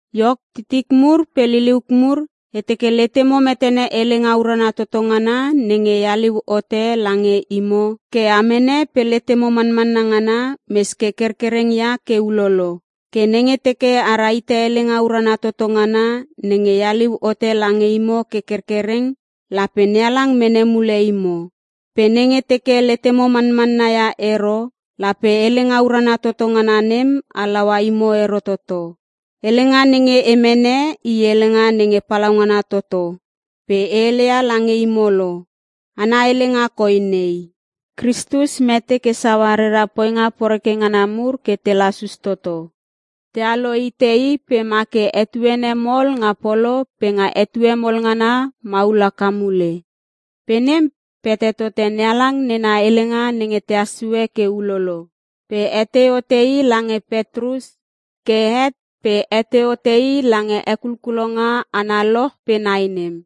Iok titik mur pe liliuk mur, e teke letemo metene helenga urana toto ngana nenge e haliu hote lange imo ke a mene pe letemo manmanna ngana mes ke kerkereng ia ke ulolo. Ke nenge teke a rahite helenga urana toto ngana nenge e haliu hote lange imo ke kerkereng, lape NeHalang mene mule imo. Pe nenge teke letemo manmanna ia ero lape helenga urana toto ngana nem halaua imo ero toto. Helenga nenge e mene i helenga nenge palaungana toto pe e heleia lange imo lo. Ana helenga koi nei: “Kristus mete ke saua rera poinga poreke ngana mur ke te lasus toto. Tealo hite I pe ma ke etuene mol nga polo pe nga etue mol ngana maul haka mule. Pe nem pete tote NeHalang nena helenga nenge te hassue ke ulolo.” Pe hetei hote i lange Petrus, ke het pe hetei hote i lange hekulkulonga analoch pe nai nem.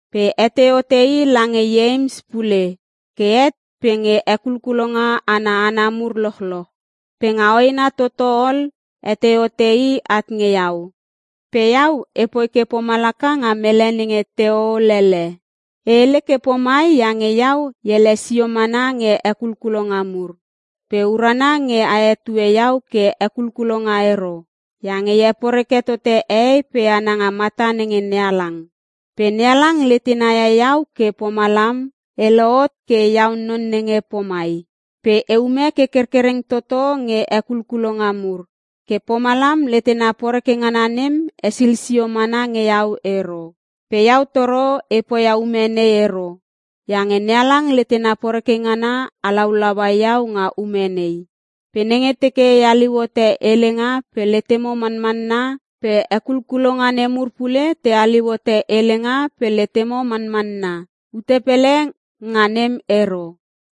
Pe hetei hote i lange Ieims pule ke het pe nge hekulkulonga ana hana mur lochloch. Pe nga hoena toto ol hetei hote i at nge iau, pe iau epoi ke pomalaka nga mele nenge te hoho lele. E hele ke pomai iange iau e ele sio mana nge hekulkulonga mur. Pe urana nge a hetue iau ke hekulkulonga ero iange e heporeke tote hehei pe hana nga mata nenge NeHalang. Pe NeHalang letena ia iau ke pomalam e lohot ke iau non nenge pomai. Pe eume ke kerkereng toto nge hekulkulonga mur, ke pomalam letena poreke ngana nem hesil sio mana nge iau ero. Pe iau toro e poia ume nei ero iange NeHalang letena poreke ngana halaulaua iau nga ume nei. Pe nenge teke e haliu hote helenga pe letemo manmanna pe hekulkulonga nemur pule te haliu hote helenga pe letemo manmanna, ute pele nga nem ero.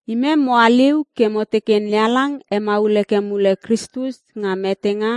Imem mo haliu ke mo teke NeHalang hemaul heke mule Kristus nga metenga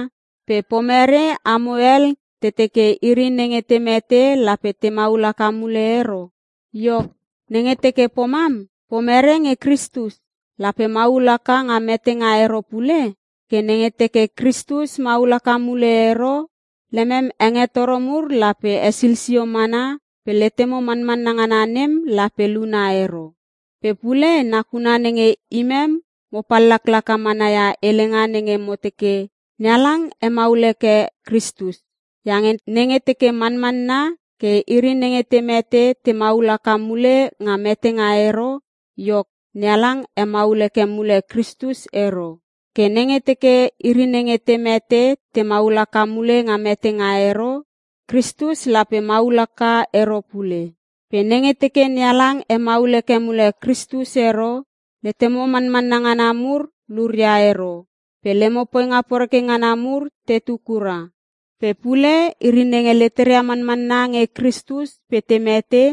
pe pomerei amo hel te teke iri nenge te mete lape te maul haka mule ero? Iok, nenge teke pomam, pomerei nge Kristus? Lape maul haka nga metenga ero pule? Ke nenge teke Kristus maul haka mule ero, lemem hengetoro mur lape hesil sio mana pe letemo manmanna ngana nem lape luna ero. Pe pule nakuna nenge imem mo pallaklaka mana ia helenga nenge mo teke NeHalang hemaul heke Kristus. Iange nenge teke manmanna ke iri nenge te mete te maul haka mule nga metenga ero, iok NeHalang hemaul heke mule Kristus ero. Ke nenge teke iri nenge te mete te maul haka mule nga metenga ero Kristus lape maul haka ero pule. Pe nenge teke NeHalang hemaul heke mule Kristus ero, letemo manmanna ngana mur luria ero pe lemo poinga poreke ngana mur tetu kura. Pe pule iri nenge leteria manmanna nge Kristus pe te mete,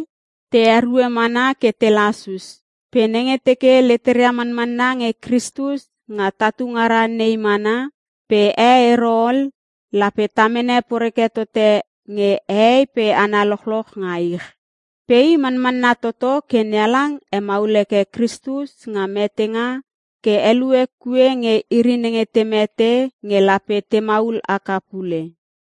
te erue mana ke te lasus. Pe nenge teke letera manmanna nge Kristus nga tatu ngara nei mana, pe e ero ol lape ta mene poreke tote nge hehei pe hana lochloch nga ich. Pe i manmanna toto ke NeHalang hemaul heke Kristus nga metenga ke helue kue nge iri nenge te mete nge lape te maul haka pule.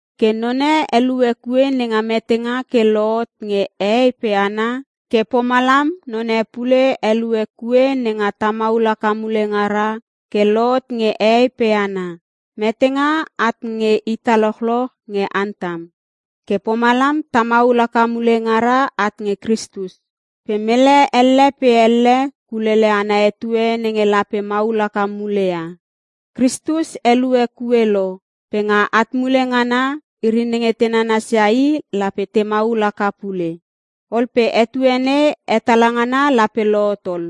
Ke none helue kue nenga metenga ke lohot nge hehei pe hana ke pomalam none pule helue kue nenga ta maul haka mule ngara ke lohot nge hehei pe hana. Metenga at nge ita lochloch nge Antam. Ke pomalam ta maul haka mule ngara at nge Kristus. Pe mele elle pe elle kulele ana etue nenge lape maul haka muleia. Kristus helue kue lo pe nga at mule ngana, iri nenge te nanasia i lape te maul haka pule. Ol pe etue nei hetala ngana lape lohot ol: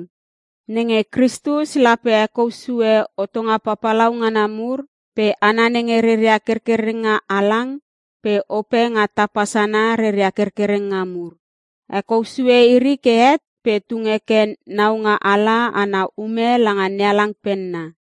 Nenge Kristus lape hekou sue hotonga papalau ngana mur pe hana nenge reria kerkerenga halang pe ope nga tapa sana reria kerkerenga mur. Hekou sue iri ke het pe tung heke naungaala ana ume langa NeHalang penna.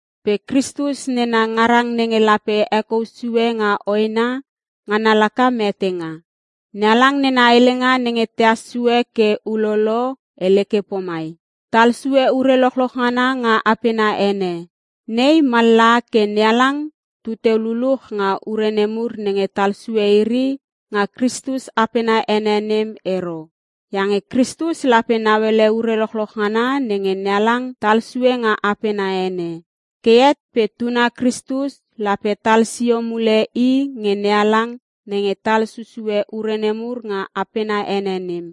Pe Kristus nena ngarang nenge lape hekou sue nga hoena, ngana laka metenga. NeHalang nena helenga nenge tehas sue ke ulolo hele ke pomai, “Tal sue ure lochloch ngana nga apena ene.” Nei mallaha ke NeHalang tuteu luluch nga ure nemur nenge tal sue iri nga Kristus apena ene nem ero. Iange Kristus lape nauele ure lochloch ngana nenge NeHalang tal sue nga apena ene. Ke het pe Tuna Kristus lape tal sio mule i nge NeHalang nenge tal susue ure nemur nga apena ene nem.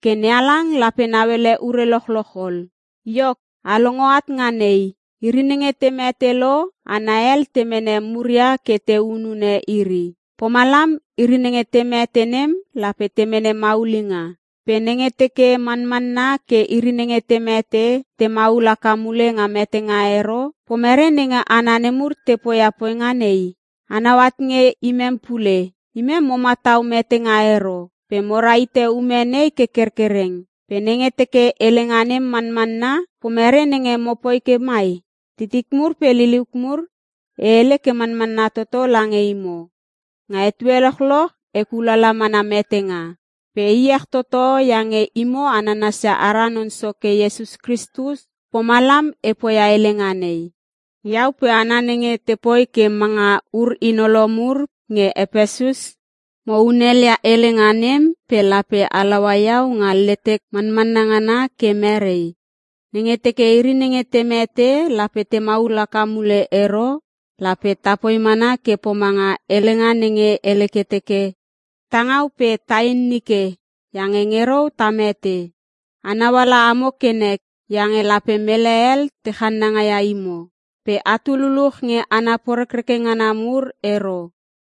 Ke NeHalang lape nauele ure lochloch ol. Iok, a longo at nga nei: Iri nenge te mete lo hana hel te mene muria ke te henune iri. Pomalam iri nenge te mete nem lape te mene maulinga. Pe nenge teke manmanna ke iri nenge te mete te maul haka mule nga metenga ero, pomerei nenge hana nemur te poia poinga nei? Anau at nge imem pule. Imem mo matau metenga ero pe mo rahite ume nei ke kerkereng. Pe nenge teke helenga nem manmanna pomerei nenge mopoi ke mai? Titik mur pe liliuk mur, e hele ke manmanna toto lange imo. Nga etue lochloch e kulala mana metenga. Pe e iech toto iange imo a nanansia ara Non Soke Iesus Kristus pomalam e poia helenga nei. Iau pe hana nenge tepoi ke manga ur hinolo mur nge Epesus, mo hunel ia helenga nem pe lape halaua iau nga letek manmanna ngana ke merei, nenge teke iri nenge te mete lape te maul haka mule ero? Lape tapoi mana ke pomanga helenga nenge hele ke teke, “Ta ngau pe tain nike iange nge rou ta mete.” A nauala amo kenek iange lape mele hel te channanga ia imo. Pe atu luluch nge hana porekreke ngana mur ero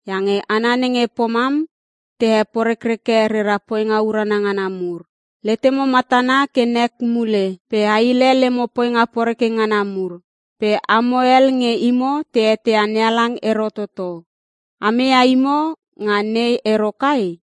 iange hana nenge pomam te he porekreke rera poinga urana ngana mur. Letemo matana ke nek mule pe a hile lemo poinga poreke ngana mur. Pe amo hel nge imo te eteia NeHalang ero toto, ameia imo nga nei ero kai?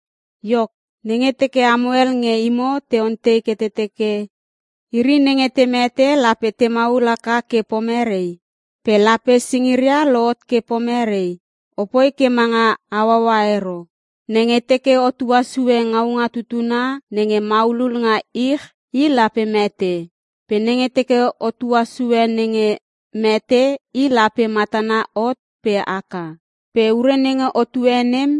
Iok, nenge teke amo hel nge imo te ontei ke te teke, “Iri nenge te mete lape te maul haka ke pomerei? Pe lape singiria lohot ke pomerei?” Opoi ke manga hauaua ero! Nenge teke otua sue ngaunga tutuna nenge maulul nga ich i lape mete. Pe nenge teke otua sue nenge mete i lape matana hot pe haka. Pe ure nenge otue nem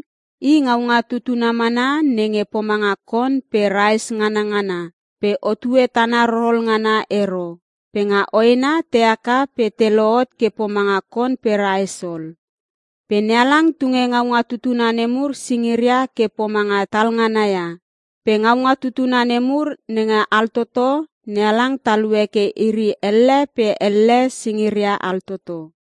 i ngaunga tutuna mana nenge pomanga kon pe raes nganangana pe otue tana rorol ngana ero. Pe nga hoena te haka pe te lohot ke pomanga kon pe raes ol. Pe NeHalang tunge ngaunga tutuna nemur singiria ke pomanga tal ngana ia. Pe ngaunga tutuna nemur nenge altoto NeHalang talue ke iri elle pe elle singiria altoto.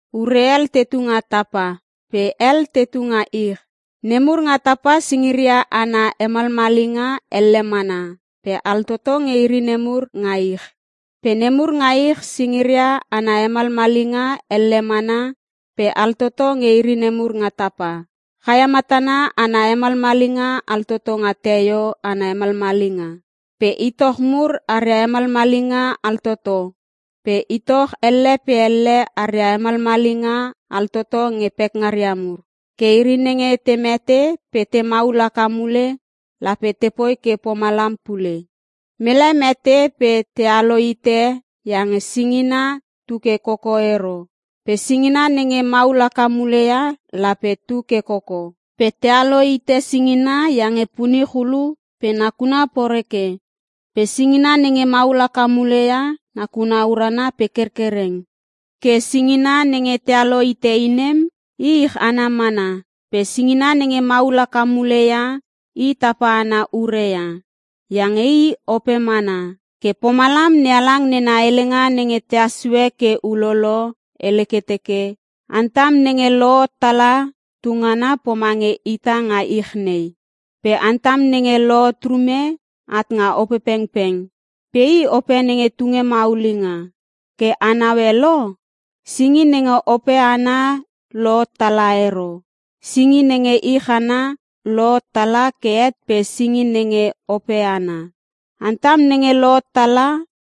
Ure hel tetu nga tapa pe hel tetu nga ich. Nemur nga tapa singiria ana hemalmalinga elle mana pe altoto nge iri nemur nga ich. Pe nemur nga ich singiria ana hemalmalinga elle mana pe altoto nge iri nemur nga tapa. Chaia matana ana hemalmalinga altoto nga teio ana hemalmalinga. Pe itoch mur aria hemalmalinga altoto pe itoch elle pe elle aria hemalmalinga altoto nge pekngaria mur. Ke iri nenge te mete pe te maul haka mule lape tepoi ke pomalam pule. Mele mete pe tealo hite iange singina tu ke koko ero pe singina nenge maul haka mule ia lape tu ke koko. Pe tealo hite singina iange punich ulu pe nakuna poreke pe singina nenge maul haka mule ia nakuna urana pe kerkereng. Ke singina nenge tealo hite nem i ich ana mana pe singina nenge maul haka mule ia i tapa ana ure ia iange i ope mana. Ke pomalam NeHalang nena helenga nenge te hassue ke ulolo hele ke teke, “Antam nenge lohot tala tungana pomange ita nga ich nei.” Pe Antam nenge lohot rume, at nga Opepengpeng pe i Ope nenge tunge maulinga. (Ke anaue lo?) Singi nenge Ope ana lohot tala ero. Singi nenge ich nei ana lohot tala ke het pe singi nenge Ope ana. Antam nenge lohot tala,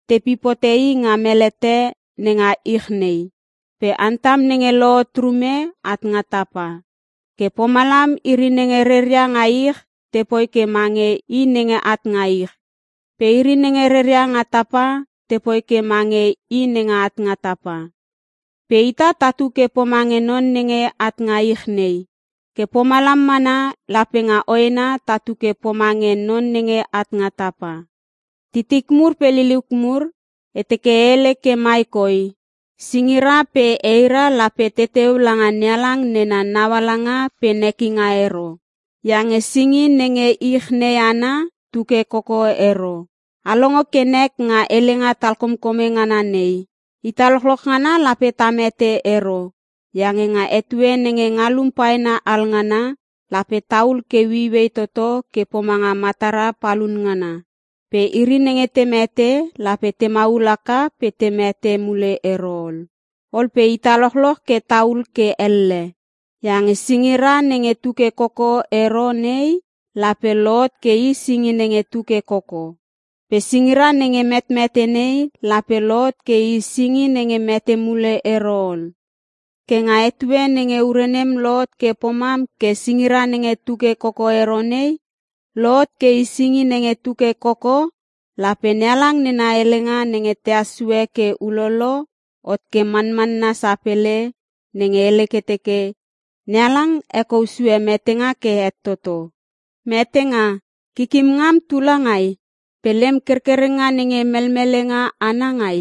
tepip hote i nga melete nenga ich nei pe Antam nenge lohot rume at nga tapa. Ke pomalam iri nenge reria nga ich tepoi ke mange i nenge at nga ich, pe iri nenge reria nga tapa tepoi ke mange i nenge at nga tapa. Pe ita tatu ke pomange non nenge at nga ich nei ke pomalam mana lape nga hoena tatu ke pomange non nenge at nga tapa. Titik mur pe liliuk mur, e teke e hele ke mai koi; Singira pe eira lape te teu langa NeHalang nena naualanga pe nekinga ero, iange singi nenge ich nei ana tu ke koko ero. A longo kenek nga helenga talkomkome ngana nei: Ita lochloch ngana lape ta mete ero iange nga etue nenge ngalum paena alngana, lape tahul ke ueiuei toto ke pomanga matara palun ngana. Pe iri nenge te mete lape te maul haka pe te mete mule ero ol pe ita lochloch ke tahul ke elle. Iange singira nenge tu ke koko ero nei lape lohot ke i singi nenge tu ke koko. Pe singira nenge metmete nei lape lohot ke i singi nenge mete mule ero ol. Ke nga etue nenge ure nem lohot ke pomam ke singira nenge tu ke koko ero nei, lohot ke i singi nenge tu ke koko, lape NeHalang nena helenga nenge te hassue ke ulolo hot ke manmanna sapele nenge hele ke teke, “NeHalang hekou sue metenga ke het toto.” “Metenga! Kikim ngam tu langai? Pe lem kerkerenga nenge melmelenga ana ngai?”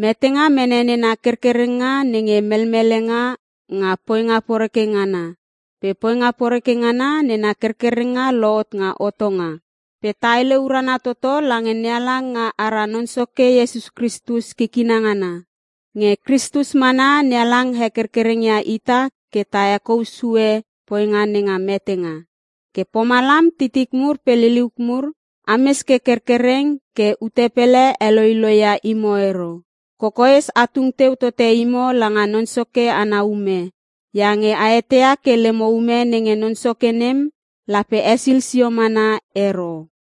Metenga mene nena kerkerenga nenge melmelenga nga poinga poreke ngana pe poinga poreke ngana nena kerkerenga lohot nga hotonga. Pe ta hele urana toto lange NeHalang nga ara Non Soke Iesus Kristus kikina ngana. Nge Kristus mana NeHalang hekerkereng ia ita ke ta hekousue poinga nenga metenga. Ke pomalam titik mur pe liliuk mur, ames ke kerkereng ke ute pele heloiloi ia imo ero. Kokoes a tung teu tote imo langa Non Soke ana ume, iange a etia ke lemo ume nenge Non Soke nem lape hesil sio mana ero.